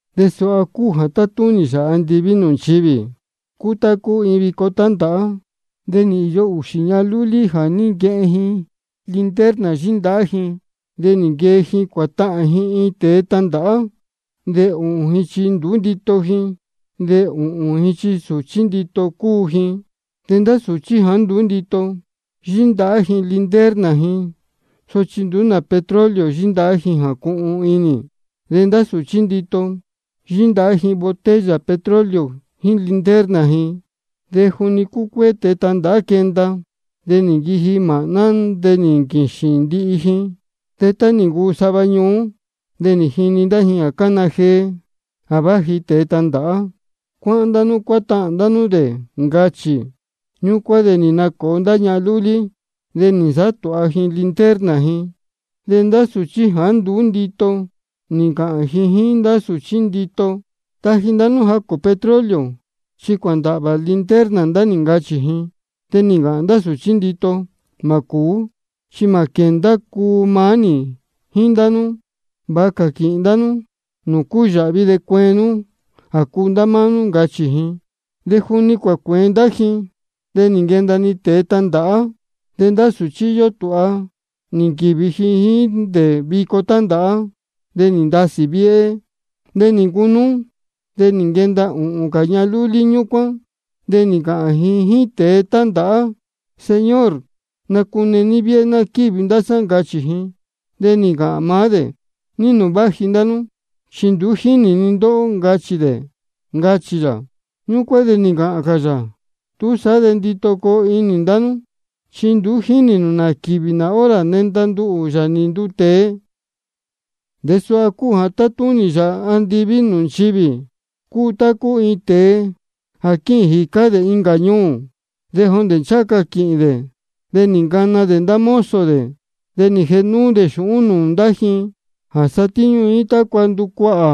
De suha cúu jā tátúnī Yāā andiví nūū nchivī: Cúu tá cúu iin vico tándāhá. De nī īyo ūxī ñahan lúlí jā ní nquehen ji linterna yíndahá ji, de nī nquee ji cuātahān ji iin tēe tandāhá. De ūhūn ji chi nduú ndito ji, de ūhūn ji chi sūchí ndito cúu ji. De ndá sūchí jāá nduú ndito, yíndahá ji linterna ji, sochi nduú nā petróleo yíndahá ji jā cuhun inī. De ndá sūchí ndito, yíndahá ji botella petróleo jíín linterna ji. De juni cúcuéé tēe tandāhá quenda, de nī nquiji māhná, de nī nquīxīn ndihi ji. De tá nī ncuu sava ñuú, de nī jinī ndá ji jā cána jee: Ja vāji tēe tandāhá. Cuáhán ndá nú cuátahān nū dē, ncachī. Ñúcuán de nī nacōo ndá ñahan lúlí, de nī nasāhá tūha ji linterna ji. De ndá sūchí jāá nduú ndito, nī ncāhān ji jíín ndá sūchí ndito: Taji ndá nú jacū petróleo, chi cuāndāhvā linterna ndá nī, ncachī ji. De nī ncāhān ndá sūchí ndito: Mā cūú, chi mā quēndá jā cuu maá nī jíín ndá nú. Vāha cā quīhīn ndá nú nūū cúyāhvi, de cueen nú jā cuu ndá máá nú. Ncachī ji. De juni cuācuēen ndá ji, de nī nquenda-ni tēe tandāhá. De ndá sūchí jā íyó tūha nī nquīvi ji jíín dē vico tándāhá. De nī ndasī viéhé. De nī ncunúú, de nī nquenda ūhūn cā ñahan lúlí ñúcuán. De nī ncāhān ji jíín tēe tándāhá: Señor, nacune ní viéhé ná quívi ndá sá, ncachī ji. De nī ncāhān maá dē: ¿Ní nūū vāji ndá nú? Chi nduú jínī ni ndóhó, ncachī dē, ncachī yā. Ñúcuán de nī ncāhān cā yā: Túsaá de ndito coo inī ndá nú, chi nduú jínī nū nā quīvī nā hora nenda nduhū, Yāā nī nduu tēe. De suha cúu jā tátúnī Yāā andiví nūū nchivī: Cúu tá cúu iin tēe jā quíhīn jīcá dē incā ñuū. De jondē ncháha ca quīhīn dē de nī ncana dē ndá mozo dē, de nī jēhe núú dē xūhún dē nūū ndá ji, jā satíñú ji jíín tácua nducuahā.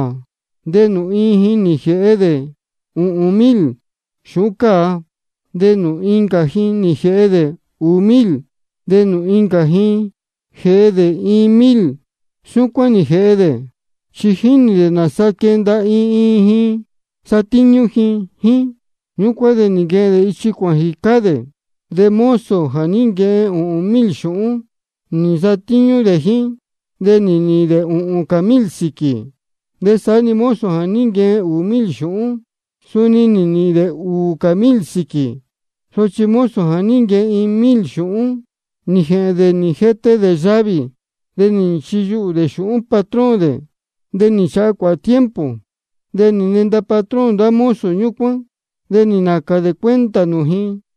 De nūū iin ji nī jēhe dē ūhūn mil xūhún cāa. De nūū incā ji nī jēhe dē ūū mil. De nūū incā ji nī jēhe dē iin mil. Súcuán nī jēhe dē, chi jínī dē nāsaa quenda iin iin ji satíñú ji jíín. Ñúcuán de nī nquehen dē ichi cuāhān jīcá dē. De mozo jā ní nquehen ūhūn mil xūhún, nī nsatíñú dē jíín. De nī nīhīn dē ūhūn cā mil sīquī. De saá-ni mozo jā ní nquehen ūū mil xūhún, suni nī nīhīn dē ūū cā mil sīquī. Sochi mozo jā ní nquehen iin mil xūhún, nī jēhēn dē nī jete dē yavī, de nī nchiyuhū dē xūhún patrón dē. De nī nchāha cuāhā tiempo, de nī nenda patrón ndá mozo ñúcuán. De nī nācān dē cuenta nūū ji.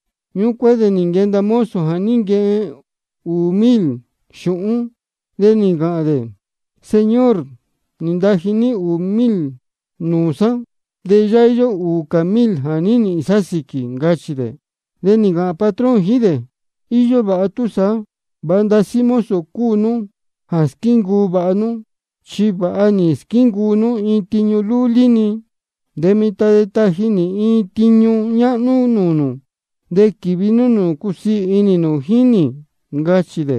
Ñúcuán de nī nquenda mozo jā ní nquehen ūū mil xūhún. De nī ncāhān dē: Señor, nī ntaji ní ūū mil nūū sá, de yáhá íyó ūū cā mil jā ní nīhīn sá sīquī. Ncachī dē. De nī ncāhān patrón jíín dē: Iyó vāha túsaá. Vāha ndasí mozo cúu nú jā squíncuu vāha nú. Chi vāha nī squíncuu nú iin tiñu lúlí-ni, de mitan de taji nī iin tiñu ñáhnú nūū nū. De quīvi nú nūū cusiī inī nū jíín nī. Ncachī dē.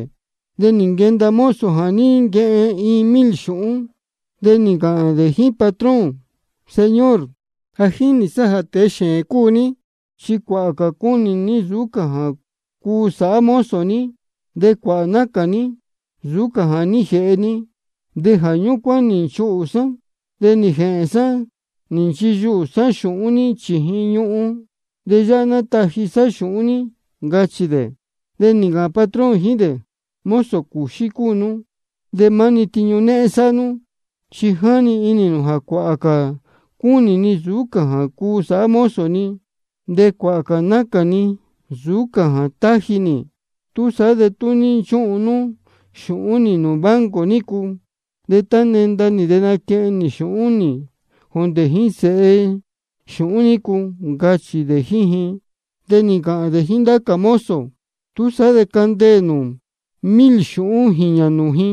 De nī nquenda mozo jā ní nquehen iin mil xūhún, de nī ncāhān dē jíín patrón: Señor, ja jínī sá níhín jā tēe xēēn cúu ní. Chi cuāhā cā cúnī ní nsūú cā jā cuu sāhá mozo ní, de cuāhā cā nácān ní nsūú cā jā ní jēhe ní. De jā ñúcuán nī nchūhú sá, de nī jēhēn sá nī nchiyuhū sá xūhún ní chījin ñuhun. De yáhá ná nátaji sá xūhún ní. Ncachī dē. De nī ncāhān patrón jíín dē: Mozo cūxí cúu nú de maá-ni tiñu néhén sáhá nú. Chi jáni inī nū jā cuāhā cā cúnī ni nsūú cā jā cuu sāhá mozo ni, de cuāhā cā nácān ni nsūú cā jā táji nī. Túsaá de tú ní nchúhun nú xūhún nī nūū banco nícu, de tá nenda nī de naquehen nī xūhún nī jondē jíín sēhe xūhún nícu. Ncachī dē jíín ji. De nī ncāhān dē jíín ndá cā mozo dē: Túsaá de candeē nū mil xūhún jīñā nūū ji,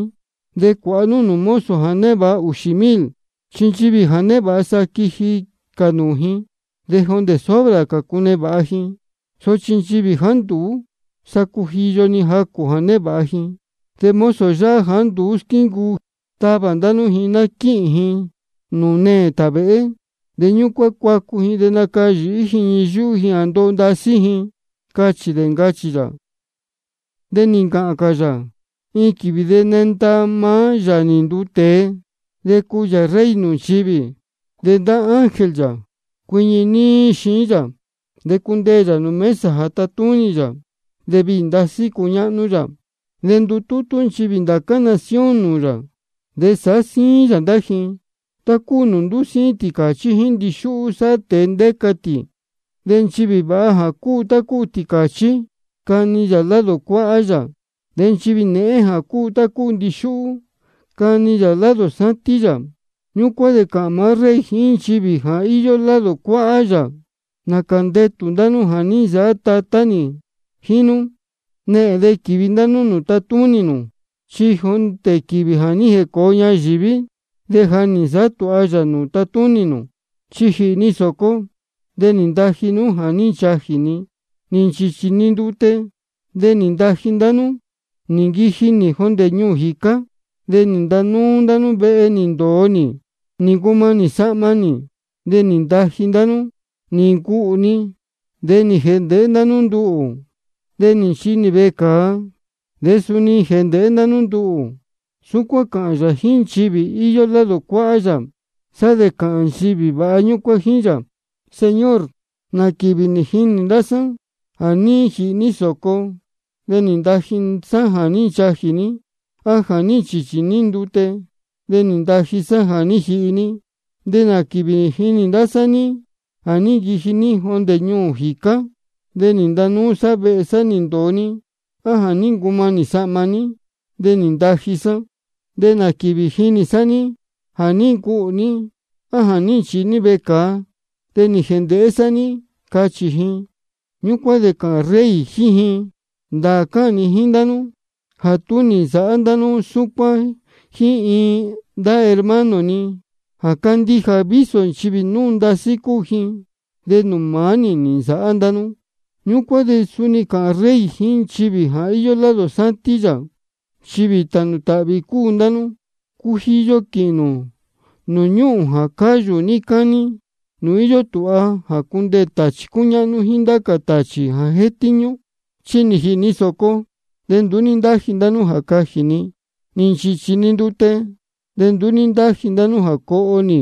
de cuāha nú nūū mozo jā névāha ūxī mil. Chi nchivī ja névāha, sa quiji cā nūū ji, de jondē sobra cā cunevāha ji. Sochi nchivī jāá nduú, sa cujiyo-ni jacū jā névāha ji. De mozo yáhá jāá nduú squíncuu, tavā ndá nú ji ná quíhīn ji nūū neē tāvēhé. De ñúcuán cuacu ji de nacayīhí ji ñii yúhú ji jā ndoho ndasí ji, ncachī dē, ncachī yā. De nī ncāhān cā yā: Iin quīvī de nenda maá Yāā nī nduu tēe, de cuu yā Rey nūū nchivī. De ndá ángel yā cuiñi níí xiín yā. De cundeē yā nūū mesa jā tatúnī yā, de viī ndasí cuñáhnú yā. De ndutútú nchivī ndācá nación nūū yā. De sāhá síín yā ndá ji, tá cúu nūū ndúsíín tīcāchí jíín ndixúhú sáhá tēe ndéca tī. De nchivī vāha jā cúu tá cúu tīcāchí, cani yā ji lado cuáhá yā. De nchivī nēhén jā cúu tá cúu ndixúhú, cani yā ji lado sátín yā. Ñúcuán de cāhān maá Rey jíín nchivī jā íyó lado cuáhá yā: Nācā ndetū ndá nú jā ní nsāhá Tatá nī jíín nú. Nehēn de quīvi ndá nú nūū tatúnī nū. Chi jondē quīvī jā ní jēcōo ñayīví de ja nī nsāhá tūha yā nūū tatúnī nū. Chi nī jīhī ni sōco, de nī ntaji ndá nú jā ní nchajī ni. Nī nchīchī ni ndute, de nī ntaji ndá nú nī jihi nī. Nī nquiji nī jondē ñuū jīcá, de nī ntanúú ndá nú vehe nī ndōo nī. Nī ncumanī sahma nī, de nī ntaji ndá nú. Nī ncuhū ni, de nī jēndēhé ndá nú nduhū. De nī nchīhi nī vecāa, de suni nī jēndēhé ndá nú nduhū. Súcuán cāhān yā jíín nchivī íyó lado cuáhá yā. Sá de cāhān nchivī vāha ñúcuán jíín yā: Señor, ¿nā quīvī nī jinī ndá sá ní jā ní jīhī ní sōco, de nī ntaji sá jā ní nchajī ní, á jā ní nchīchī ní ndute, de nī ntaji sá jā ní jihi ní? ¿De nā quīvī nī jinī ndá sá ní jā ní nquiji ní jondē ñuū jīcá, de nī ntanúú sá vehe nī ndōo ní, á jā ní ncumanī sahma ní, de nī ntaji sá? ¿De nā quīvī nī jinī sá ní jā ní ncuhū ní, á jā ní nchīhi ní vecāa, de nī jēndēhé sá ní? Cachī ji. Ñúcuán de cāhān Rey jíín ji: Ndāā cáhān ni jíín ndá nú jā tá nī nsāhá ndá nú súcuán jíín iin ndá hermano ni jā cándíja, vísō nchivī núu ndasí cúu ji, de nūū maá nī nī nsāhá ndá nú. Ñúcuán de suni cāhān Rey jíín nchivī jā íyó lado sátín yā: Nchivī jā tānū tāhvī cúu ndá nú. Cujiyo quīhīn nū nūū ñúhūn jā cáyū níí cání, nūū íyó tūha jā cundeē tāchī cúñáhnú jíín ndá cā tāchī jā jétíñú. Chi nī jīhī ni sōco, de nduú ní ntáji ndá nú jā cajī ni. Nī nchīchī ni ndute, de nduú ní ntáji ndá nú jā coho nī.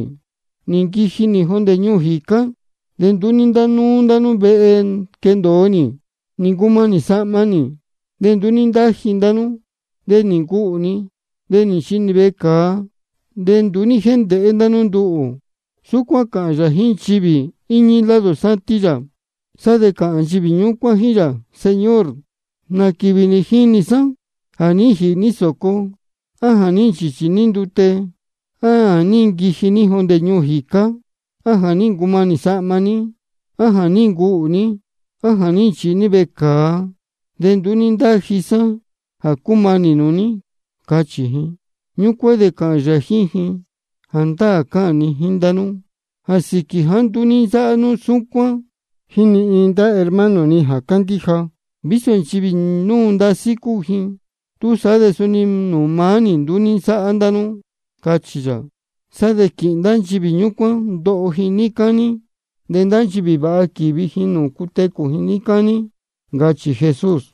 Nī nquiji nī jondē ñuū jīcá, de nduú ní ntánúú ndá nú vehe quendōo nī. Nī ncumanī sahma nī, de nduú ní ntáji ndá nú. De nī ncuhū ni, de nī nchīhi nī vecāa, de nduú ní jéndēhé ndá nú nduhū. Súcuán cāhān yā jíín nchivī jā íñí lado sátín yā. Sá de cāhān nchivī ñúcuán jíín yā: Señor, ¿nā quīvī nī jinī sá ní jā ní jīhī ní sōco, á jā ní nchīchī ní ndute, á jā ní nquiji ní jondē ñuū jīcá, á jā ní ncumanī sahma ní, á jā ní ncuhū ní, á jā ní nchīhi ní vecāa, de nduú ní ntáji sá jā cúmanī nūū ní? Cachī ji. Ñúcuán de cāhān yā jíín ji: Jāndáā cáhān ni jíín ndá nú jā sīquī jāá nduú ní nsáhá nú súcuán jíín ni iin ndá hermano ni jā cándíja, vísō nchivī núu ndasí cúu ji, túsaá de suni nūū maá nī nduú ní nsáhá ndá nú, cachī yā. Sá de quīhīn ndá nchivī ñúcuán ndoho ji níí cání. De ndá nchivī vāha, quīvi ji nūū cutecū ji níí cání, ncachī Jesús.